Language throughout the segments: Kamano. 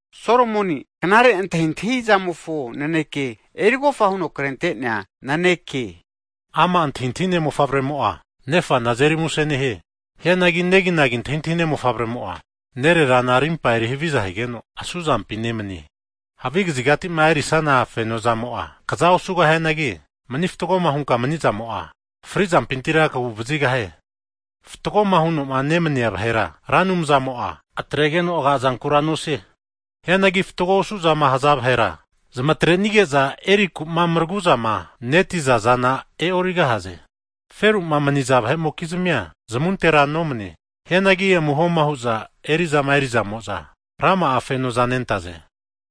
Solomoni knare antahintahi zamofo naneke, erigofa huno krente'nea naneke. Ama' antahintahine mofavremo'a, nefana azeri muse nehie. Hianagi neginagi antahintahine mofavremo'a, nererana rimpa erihaviza higeno, asuzampi nemanie. Havi kazigati'ma erisana feno zamo'a kaza osugahianagi, mani fatgoma hunka mani'zamo'a, fri zampintira kagu vazigahie. Fatgoma huno'ma nemania vahera, Ra Anumzamo'a atregeno agazankura nosie. Hianagi fatgo osu'zama haza vahera, zamatrenige'za erinaku'ma maragu'zamaneti'za zana e'origahaze. Feru'ma maniza vahe'mokizmia zamuntera nomane. Hianagi amuhoma hu'za eri'zama erizamo'za, rama'a fenoza nentaze.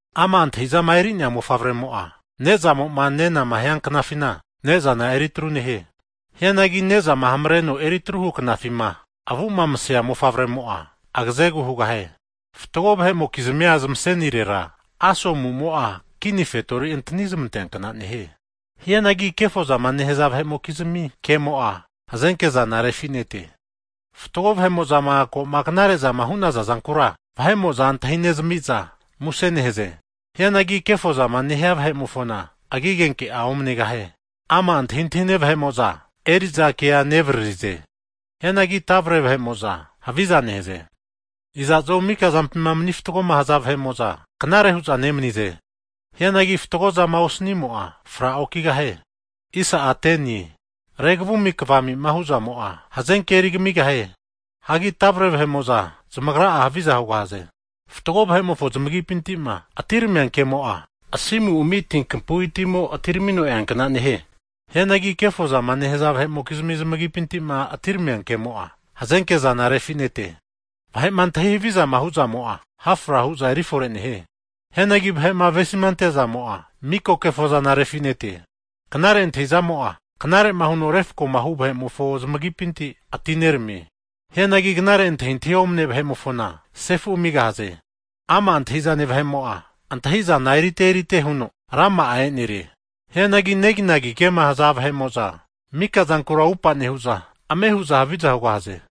Ama' antahi'zama eri'nea vahe'mo'a, ne'zamo'ma nenama hianknafina, ne'zana eritru nehie. Hianagi ne'zama hamareno eri atruhu knafima, avu'ma masea vahe'mo'a agazegu hugahie. Fatgo vahe'mokizmia zamasenirera asomu'mo'a, kini fetori antani zamanteankna nehie. Hianagi kefozama nehaza vahe'mokizmi kemo'a, hazenkezana refi'nete. Fatgo vahe'mo'zama ko'ma knare zama hu'naza zankura, vahe'mo'za antahinezmi'za muse nehaze. Hianagi kefo zama nehia vahe'mofona, agi agenke'a omanegahie. Ama' antahintahine vahe'mo'za, eri'za kea nevaririze. Hianagi tavare vahe'mo'za, haviza nehaze. Iza'zo mika zampima mani fatgoma haza vahe'mo'za, knare hu'za nemanize. Hianagi fatgo zama osnimo'a, fra'okigahie. Regavumi kavami huzamo'a, hazenke eri kamigahie. Hagi tavre vahe'mo'za zamagra'a haviza hugahaze. Fatgo vahe'mofo zamagipinti'ma atiramia kemo'a, asimu ami tinkapui'mo atiramino eankna nehie. Hianagi kefozama nehaza vahe'mokizmi zamagipinti'ma atiramia kemo'a, vahe'ma hazenkema zami zamarimpa he'zana zana refi'nete. Vahe'ma antahi havizama hu'zamo'a, ha' fra hu'za eri fore nehie. Hianagi vahe'ma avesima ante'zamo'a, miko kefozana refi'nete. Knare antahizamo'a knare'ma huno refkomahu vahe'mofo zamagipinti atineramie. Hianagi knare antahintahi omane vahe'mofona agumpi sefu amigahaze. Ama' antahi'zane vahe'mo'a, antahi'zana erite erite huno, rama'a enerie. Hianagi neginagi kema haza vahe'mo'za, mika zankura atupa nehu'za, ame hu'za haviza hugahaze.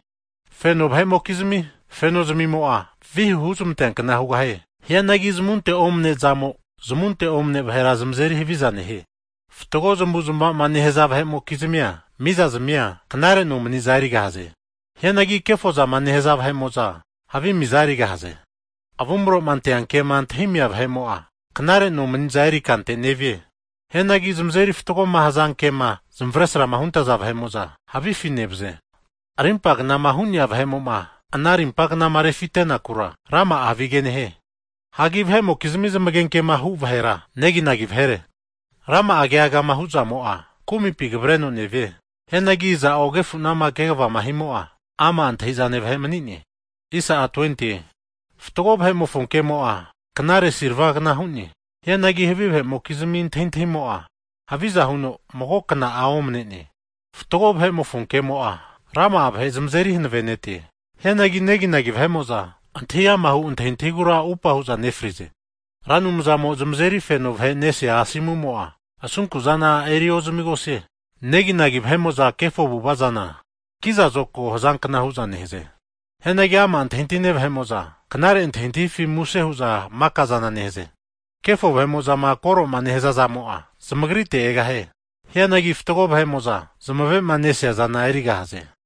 Feno vahe'mokizmi feno zamimo'a, vihu huzmanteankna hugahie. Hianagi zamunte'ma omaneazamo zamunte omane vahera zamazeri haviza nehie. Fatgo zamavu'zamava'ma nehaza vahe'mokizmia mizazmia, knare nomaniza erigahaze. Hianagi kefozama nehaza vahe'mo'za, havi miza erigahaze. Avumro'ma anteankema antahimia vahe'mo'a, knare nomaniza eri kante nevie. Hianagi zamazeri fatgoma hazanke'ma zamavesrama huntaza vahe'mo'za, havifi nevaze. Rimpa knama hu'nea vahe'mo'ma ana rimpa knama refitenakura, rama'a havige nehie. Hagi vahe'mokizmi zamagenkema hu vahera, neginagi vahere. Rama'a kegagama huzamo'a, kumipi kavareno nevie. Hianagi iza'o agefu'nama kegavama himo'a, ama' antahi'zane vahe mani'ne. Fatgo vahe'mofo kemo'a, knare silvagna hu'ne. Hianagi havi vahe'mokizmi antahintahimo'a, haviza huno mago kna'a omane'ne. Fatgo vahe'mofo kemo'a, rama'a vahe zamazeri hanavenetie. Hianagi neginagi vahe'mo'za antahi amahu antahintahigura atupa hu'za nefrize. Ra Anumzamo'a zamazeri feno vahe nesea asomumo'a, asunku'zana eri ozamigosie. Neginagi vahe'mo'za, kefo avu'ava zana kiza zokago hazankna hu'za nehaze. Hianagi ama' antahintahine vahe'mo'za, knare antahintahifi muse hu'za makaza nehaze. Kefo vahe'mo'zama koro'ma nehazazamo'a, zamagrite egahie. Hianagi fatgo vahe'mo'za zamave'ma nesiazana erigahaze.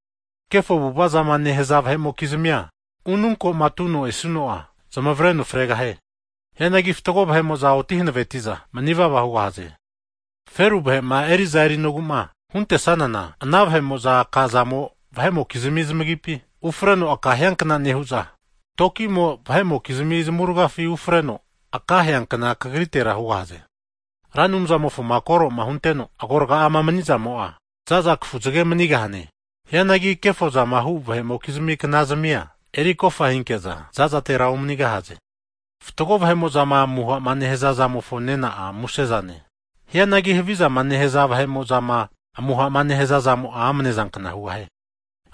Kefo avu'avazama nehaza vahe'mokizmia unu ko'ma atuno esuno'a, zamavareno fregahie. Hianagi fatgo vahe'mo'za oti hanaveti'za, mani'vava hugahaze. Feru vahe'ma eri'za erinogu'ma huntesanana, ana vahe'mo'za aka'zamo vahe'mokizmi zamagipi ufreno akahiankna nehu'za, tokimo vahe'mokizmi zamavurgafi ufareno aka heankna kagritera hugahaze. Ra Anumzamofoma koro'ma hunteno agorga'ama mani'zamo'a, za'za kafuzage manigahane. Hianagi kefozama hu vahe'mokizmia knazamia erikofa hinke'za, za'zatera omanigahaze. Fatgo vahe'mo'zama amuha'ma nehaza zamofo nena'a musezane. Hianagi havi avu'ava'zama nehaza vahe'mo'zama amuha'ma nehazazamo'a amene zankna hugahie.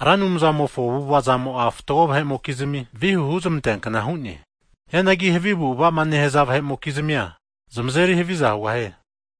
Ra Anumzamofo avu'ava'zamo'a fatgo vahe'mokizmi, vihu huzmanteankna hu'ne. Hianagi havi avu'ava'zama nehaza vahe'mokizmia, zamazeri haviza hugahie.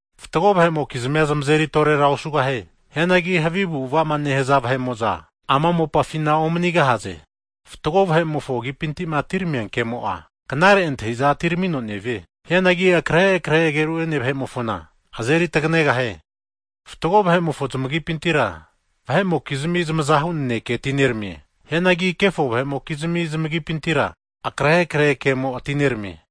Fatgo vahe'mokizmia zamazeri torera osugahie. Hianagi havi zamavu'zmava'ma nehaza vahe'mo'za ama'na mopafina omanigahaze. Fatgo vahe'mofo agipinti'ma atiramia kemo'a, knare antahi'za atiramino nevie. Hianagi akrehe krehe ageru'ene vahe'mofona azeri taganegahie. Fatgo vahe'mofo zamagipintira vahe'mokizmi zamazahu naneke atineramie. Hianagi kefo vahe'mokizmi zamagipintira, akrehe krehe kemo atineramie.